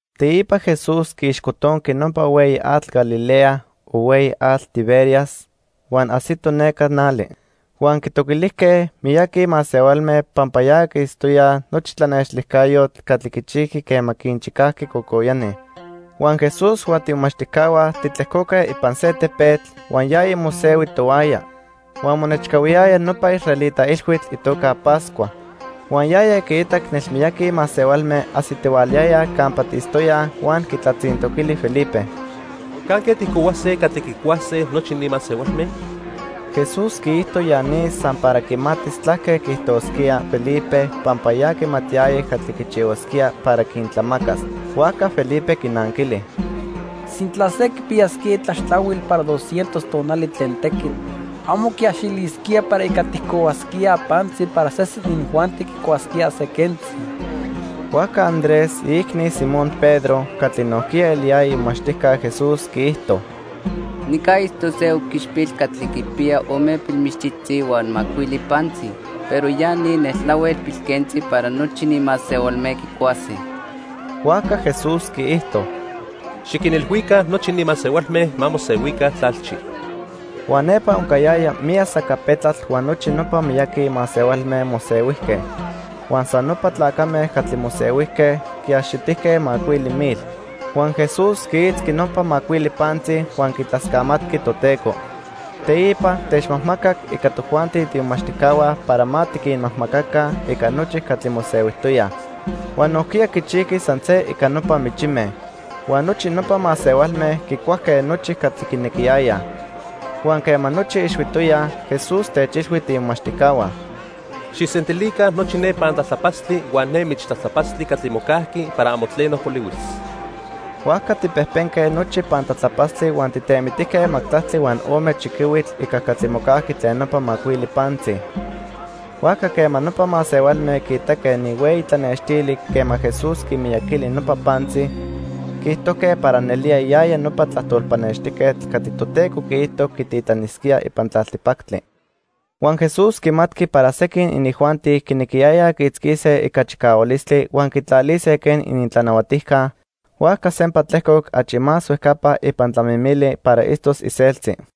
Teipa Jesús quiixcotonqui nopa Hueyi Atl Galilea o Hueyi Atl Tiberias huan ajsito neca nali. Huan quitoquilijque miyaqui masehualme pampa ya quiitztoyaj nopa tlanextilijcayotl catli quichijqui quema quinchicajqui cocoyani. Huan Jesús huan tiimomachtijcahua titlejcoque ipan se tepetl, huan yaya mosehui tohuaya. Huan monechcahuiyaya nopa israelita ilhuitl itoca Pascua. Huan yaya quiitac nelmiyaqui masehualme ajsitihualayayaj campa tiitztoyaj huan quitlatzintoquili Felipe: —¿Canque tijcohuase catli quicuase nochi ni masehualme? Jesús quiijto ya ni san para quimatis tlaque quiijtosquía Felipe pampa ya quimatiyaya catli quichihuasquía para quintlamacas. Huajca Felipe quinanquili: —Sintla se quipiyasquía itlaxtlahuil para dos cientos tonali tlen tequitl, amo quiaxilisquía para ica tijcohuasquíaj pantzi para sesen inijuanti quicuasquíaj se quentzi. Huajca Andrés, iicni Simón Pedro, catli nojquiya eliyaya imomachtijca Jesús quiijto: —Nica itztoc se oquichpil catli quipiya ome pilmichtzitzi huan macuili pantzi, pero ya ni neltlahuel pilquentzi para nochi ni masehualme quicuase. Huajca Jesús quiijto: —Xiquinilhuica nochi ni masehualme ma mosehuica tlalchi. Huan nepa oncayaya miyac sacapetlatl huan nochi nopa miyaqui masehualme mosehuijque. Huan san nopa tlacame catli mosehuijque, quiaxitijque macuili mil. Huan Jesús quiitzqui nopa macuili pantzi huan quitlascamatqui Toteco. Teipa, techmajmacac ica tojuanti tiimomachtijcahua para ma tiquinmajmacaca ica nochi catli mosehuijtoyaj. Huan nojquiya quichijqui san se ica nopa michime. Huan nochi nopa masehualme quicuajque nochi catli quinequiyayaj. Huan quema nochi ixhuitoyaj, Jesús techilhui tiimomachtijcahua: —Xijsentilica nochi ne pantlatlapatztli huan ne michtlatlapatztli catli mocajqui para amo tleno polihuis. Huajca tijpejpenque nochi pantlatlapatztli huan tijtemitijque majtlactli huan ome chiquihuitl ica catli mocajqui tlen nopa macuili pantzi. Huajca quema nopa masehualme quiitaque ni hueyi tlanextili quema Jesús quimiyaquili nopa pantzi, quiijtojque para nelía yaya nopa tlajtol pannextijquetl catli Toteco quiijto quititlanisquía ipan tlaltipactli. Huan Jesús quimatqui para sequin inijuanti quinequiyayaj quiitzquise ica chicahualistli huan quitlalise quen inintlanahuatijca, huajca sempa tlejcoc achi más huejcapa ipan tlamimili para itztos iseltzi.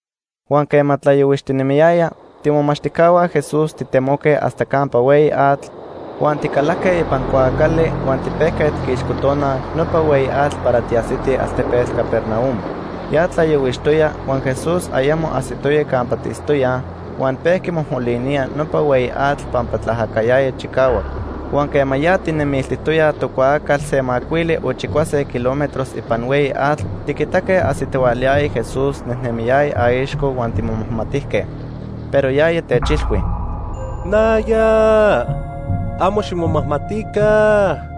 Huan quema tlayohuixtinemiyaya, tiimomachtijcahua Jesús titemoque hasta campa hueyi atl, huan ticalajque ipan cuaacali huan tipejque tiquixcotonaj nopa hueyi atl para tiajsitij altepetl Capernaum. Ya tlayohuixtoya huan Jesús ayamo ajsitoya campa tiitztoyaj, huan pejqui mojmolinía nopa hueyi atl pampa tlaajacayaya chicahuac. Huan quema ya tijnejnemiltijtoyaj tocuaacal se macuili o chicuase kilómetros ipan hueyi atl, tiquitaque ajsitihualayaya Jesús nejnemiyaya aixco huan timomajmatijque. Pero yaya techilhui: —Naya, amo ximomajmatica.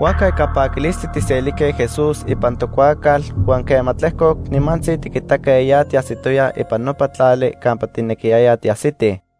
Huajca ica paquilistli tijselijque Jesús ipan tocuaacal huan quema tlejcoc, nimantzi tiquitaque ya tiajsitoyaj ipan nopa tlali campa tijnequiyayaj tiajsitij.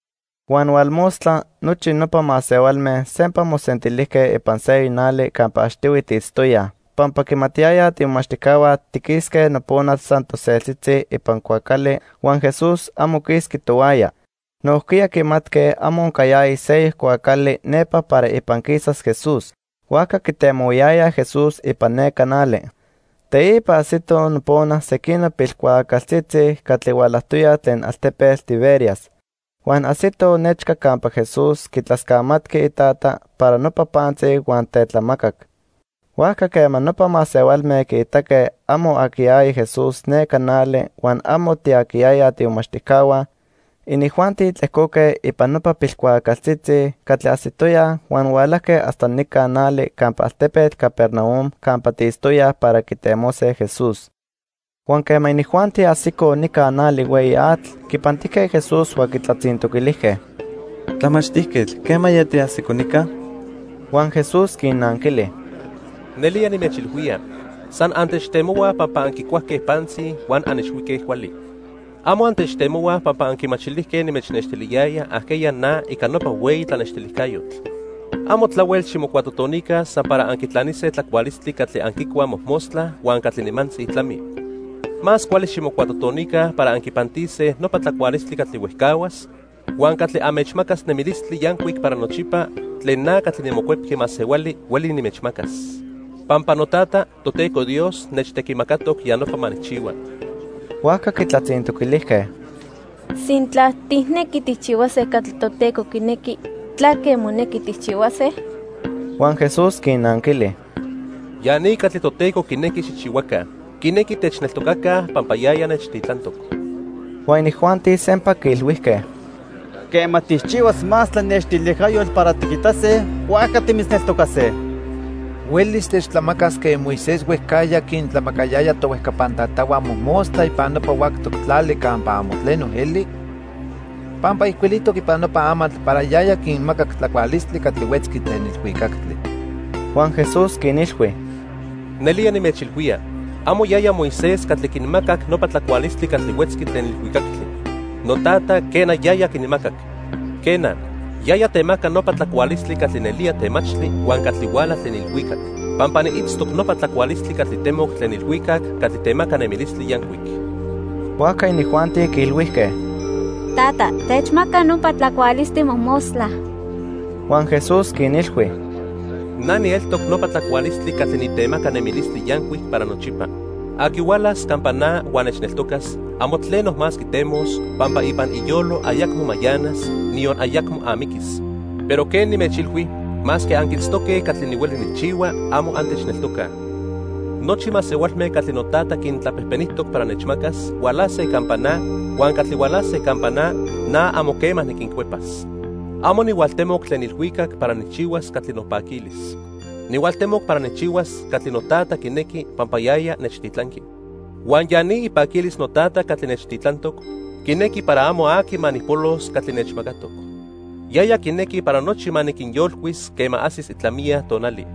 Huan hualmostla nochi nopa masehualme sempa mosentilijque ipan seyoc nali campa achtihui tiitztoyaj pampa quimatiyayaj tiimomachtijcahua tiquisque nopona san toseltzitzi ipan cuaacali huan Jesús amo quisqui tohuaya. Nojquiya quimatque amo oncayaya seyoc cuaacali nepa para ipan quisas Jesús. Huajca quitemohuayayaj Jesús ipan neca nali. Teipa ajsitoj nopona sequinoc pilcuaacaltzitzi catli hualajtoyaj tlen altepetl Tiberias. Huan ajsitoj nechca campa Jesús quitlascamatqui iTata para nopa pantzi huan tetlamacac. Huajca quema nopa masehualme quiitaque amo aquiyaya Jesús neca nali huan amo tiaquiyayaj tiimomachtijcahua, inijuanti tlejcoque ipan nopa pilcuaacaltzitzi catli ajsitoyaj huan hualajque hasta nica nali campa altepetl Capernaum campa tiitztoyaj para quitemose Jesús. Huan quema inijuanti ajsicoj nica nali hueyi atl, quipantijque Jesús huan quitlatzintoquilijque: —Tlamachtijquetl, ¿quemaya tiajsico nica? Huan Jesús quinnanquili: —Nelía nimechilhuía, san antechtemohuaj pampa anquicuajque pantzi huan anixhuique cuali. Amo antechtemohuaj pampa anquimachilijque nimechnextiliyaya ajqueya na ica nopa hueyi tlanextilijcayotl. Amo tlahuel ximocuatotonica san para anquitlanise tlacualistli catli anquicuaj mojmostla huan catli nimantzi tlami. Más cuali ximocuatotonica para anquipantise nopa tlacualistli catli huejcahuas huan catli anmechmacas nemilistli yancuic para nochipa tlen na catli niMocuepqui Masehuali hueli nimechmacas. Pampa noTata, Toteco Dios, nechtequimacatoc ya nopa ma nijchihua. Huajca quitlatzintoquilijque: —Sintla tijnequi tijchihuase catli Toteco quinequi, ¿tlaque monequi tijchihuase? Huan Jesús quinnanquili: —Ya ni catli Toteco quinequi xijchihuaca. Quinequi techneltocaca pampa yaya nechtitlantoc. Huan inijuanti sempa quiilhuijque: —Quema tijchihuas más tlanextilijcayotl para tiquitase, huajca timitzneltocase. ¿Huelis techtlamacas quen Moisés huejcajya quintlamacayaya tohuejcapan tatahua mojmostla ipan nopa huactoc tlali campa amo tleno eli? Pampa ijcuilijtoc ipan nopa amatl para yaya quinmacac tlacualistli catli huetzqui tlen ilhuicactli. Huan Jesús quinilhui: —Nelía nimechilhuía, amo yaya Moisés catli quinmacac nopa tlacualistli catli huetzqui tlen ilhuicactli. NoTata, quena, yaya quinmacac. Quena, yaya temaca nopa tlacualistli catli nelía temachtli huan catli huala tlen ilhuicac. Pampa niitztoc nopa tlacualistli catli temoc tlen ilhuicac catli temaca nemilistli yancuic. Huajca inijuanti quiilhuijque: —Tata, techmaca nopa tlacualistli mojmostla. Huan Jesús quinilhui: —Na nieltoc nopa tlacualistli catli nitemaca nemilistli yancuic para nochipa. Aqui hualas campa na huan nechneltocas, amo tleno más quitemos, pampa ipan iyolo ayacmo mayanas, niyon ayacmo amiquis. Pero quen nimechilhui, masque anquiitztoque catli nihueli nijchihua, amo antechneltocaj. Nochi masehualme catli noTata quintlapejpenijtoc para nechmacas, hualase campa na, huan catli hualase campa na, na amo quema niquincuepas. Amo nihualtemoc tlen ilhuicac para nijchihuas catli nopaquilis. Nihualtemoc para nijchihuas catli noTata quinequi pampa yaya nechtitlanqui. Huan ya ni ipaquilis noTata catli nechtitlantoc, quinequi para amo aqui ma nijpolos catli nechmacatoc. Yaya quinequi para nochi ma niquinyolcuis quema ajsis itlamiya tonali.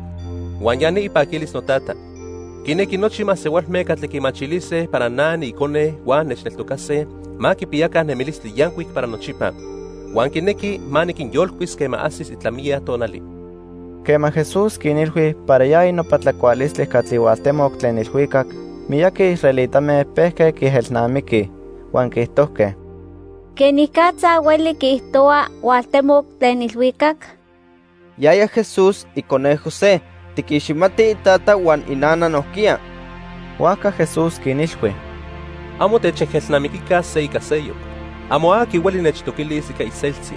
Huan ya ni ipaquilis noTata. Quinequi nochi masehualme catli quimachilise para na niIcone huan nechneltocase, ma quipiyaca nemilistli yancuic para nochipa. Huan quinequi ma niquinyolcuis quema ajsis itlamiya tonali. Quema Jesús quinilhui para yaya nopa tlacualistli catli hualtemoc tlen ilhuicac, miyaqui israelitame pejque quiejelnamiquij. Huan quiijtojque: —¿Quenicatza hueli quiijtohua hualtemoc tlen ilhuicac? Yaya Jesús, icone José. Tiquiximatij itata huan inana nojquiya. Huajca Jesús quinilhui: —Amo techejelnamiquica se ica seyoc. Amo aqui hueli nechtoquilis ica iseltzi.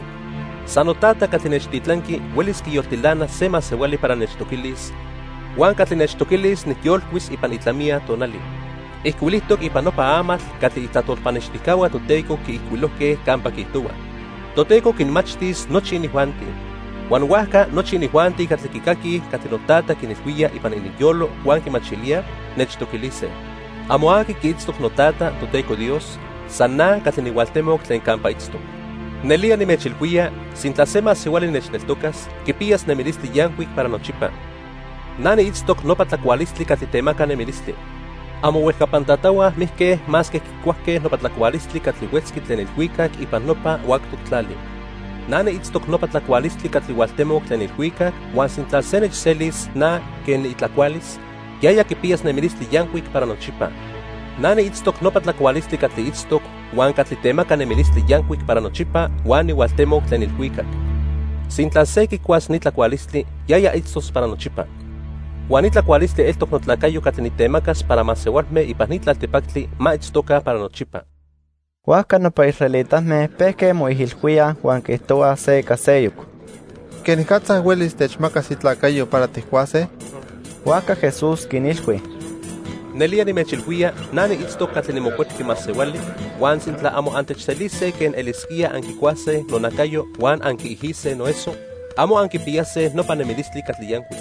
San noTata catli nechtitlanqui huelis quiyoltilanas se masehuali para nechtoquilis, huan catli nechtoquilis nijyolcuis ipan itlamiya tonali. Ijcuilijtoc ipan nopa amatl catli itlajtol pannextijcahua Toteco quiijcuilojque campa quiijtohua: 'Toteco quinmachtis nochi inijuanti.' Huan huajca nochi inijuanti catli quicaquij catli noTata quinilhuía ipan ininyolo huan quimachilíaj, nechtoquilise. "Amo aqui quiitztoc noTata, Toteco Dios, san na catli nihualtemoc tlen campa itztoc. Nelía nimechilhuía, sintla se masehuali nechneltocas, quipiyas nemilistli yancuic para nochipa. Na niitztoc nopa tlacualistli catli temaca nemilistli. Amohuejcapan tatahua mijque masque quicuajque nopa tlacualistli catli huetzqui tlen ilhuicac ipan nopa huactoc tlali. Na niitztoc nopa tlacualistli catli hualtemoc tlen ilhuicac huan sintla se nechselis na quen niitlacualis, yaya quipiyas nemilistli yancuic para nochipa. Na niitztoc nopa tlacualistli catli itztoc huan catli temaca nemilistli yancuic para nochipa huan nihualtemoc tlen ilhuicac. Sintla se quicuas ni tlacualistli, yaya itztos para nochipa. Huan ni tlacualistli eltoc notlacayo catli nitemacas para masehualme ipan ni tlaltipactli ma itztoca para nochipa." Huajca nopa israelitame pejque moijilhuíaj huan quiijtohuaj se ica seyoc: —¿Quenicatza huelis techmacas itlacayo para tijcuase? Huajca Jesús quinilhui: —Nelía nimechilhuía na niitztoc catli niMocuepqui Masehuali, huan sintla amo antechselise quen elisquía anquicuase nonacayo huan anquiijise noeso, amo anquipiyase nopa nemilistli catli yancuic.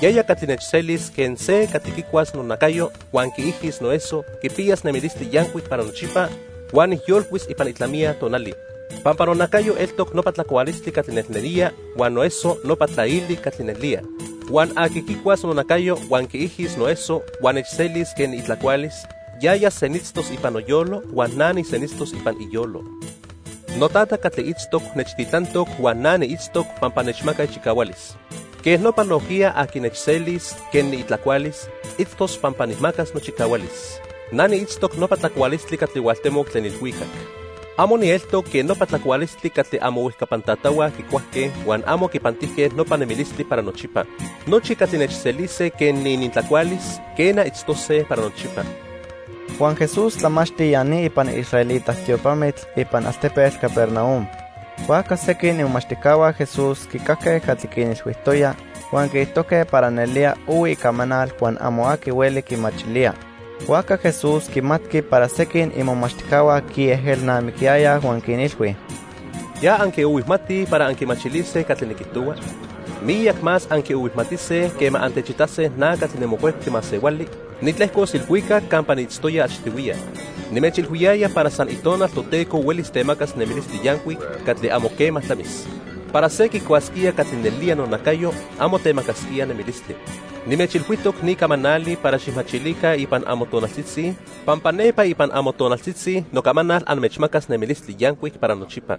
Yaya catli nechselis quen se catli quicuas nonacayo huan quiijis noeso quipiyas nemilistli yancuic para nochipa huan nijyolcuis ipan itlamiya tonali. Pampa nonacayo eltoc nopa tlacualistli catli nelnelía huan noeso nopa tlaili catli nelía. Huan aqui quicuas nonacayo huan quiijis noeso huan nechselis quen niitlacualis, yaya senitztos ipan noyolo huan na nisenitztos ipan iyolo. NoTata catli itztoc nechtitlantoc huan na niitztoc pampa nechmaca ichicahualis. Quej nopa nojquiya aqui nechselis quen niitlacualis, itztos pampa nijmacas nochicahualis. Na niitztoc nopa tlacualistli catli hualtemoc tlen ilhuicac. Amo nieltoc quen nopa tlacualistli catli amohuejcapan tatahua quicuajque huan amo quipantijque nopa nemilistli para nochipa. Nochi catli nechselise quen niinintlacualis, quena, itztose para nochipa. Huan Jesús tlamachti ya ni ipan israelita tiopamitl ipan altepetl Capernaum. Huajca sequin imomachtijcahua Jesús quicajque catli quinilhuijtoya, huan quiijtojque para nelía ohui icamanal huan amo aqui hueli quimachilía. Huajca Jesús quimatqui para sequin imomachtijcahua quiejelnamiquiyayaj huan quinilhui: —¿Ya anquiohuijmatij para anquimachilise catli niquijtohua? Miyac más anquiohuijmatise quema antechitase na catli niMocuepqui Masehuali, nitlejcos ilhuicac campa niitztoya achtihuiya. Nimechilhuiyaya para san Itonal Toteco huelis temacas nemilistli yancuic catli amo quema tlamis. Para se quicuasquía catli nelía nonacayo amo temacasquía nemilistli. Nimechilhuijtoc ni camanali para xijmachilica ipan amotonaltzitzi pampa nepa ipan amotonaltzitzi nocamanal anmechmacas nemilistli yancuic para nochipa.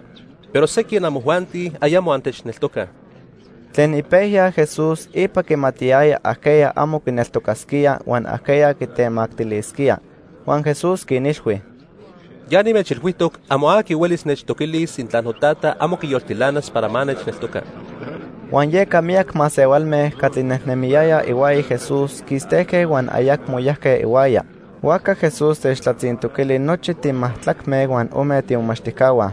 Pero sequin amojuanti ayamo antechneltocaj. Tlen ipejya Jesús ipa quimatiyaya ajqueya amo quineltocasquía huan ajqueya quitemactilisquía. Huan Jesús quinilhui: —Ya nimechilhuijtoc amo aqui huelis nechtoquilis sintla noTata amo quiyoltilanas para ma nechneltoca. Huan yeca miyac masehualme catli nejnemiyayaj ihuaya Jesús quistejque huan ayacmo yajque ihuaya. Huajca Jesús techtlatzintoquili nochi timajtlacme huan ome tiimomachtijcahua: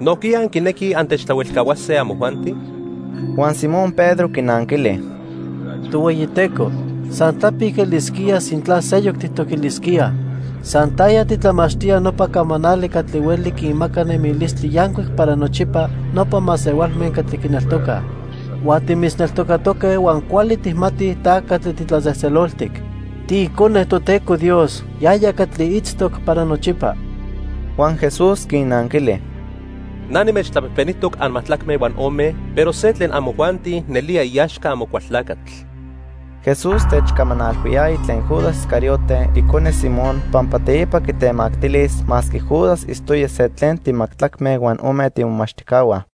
—¿Nojquiya anquinequij antechtlahuelcahuase amojuanti? Huan Simón Pedro quinanquili: —Tohueyiteco, san tlapic elisquía sintla seyoc tijtoquilisquíaj. San taya titlamachtía nopa camanali catli hueli quinmaca nemilistli yancuic para nochipa nopa masehualme catli quineltocaj. Huan timitzneltocatoque huan cuali tijmatij ta catli titlatzejtzeloltic. TiIcone Toteco Dios, yaya catli itztoc para nochipa. Huan Jesús quinnanquili: —Na nimechtlapejpenijtoc anmajtlacme huan ome, pero se tlen amojuanti nelía iaxca Amocualtlacatl. Jesús techcamanalhuiyaya tlen Judas Iscariote icone Simón pampa teipa quitemactilis masque Judas itztoya se tlen timajtlacme huan ome tiimomachtijcahua.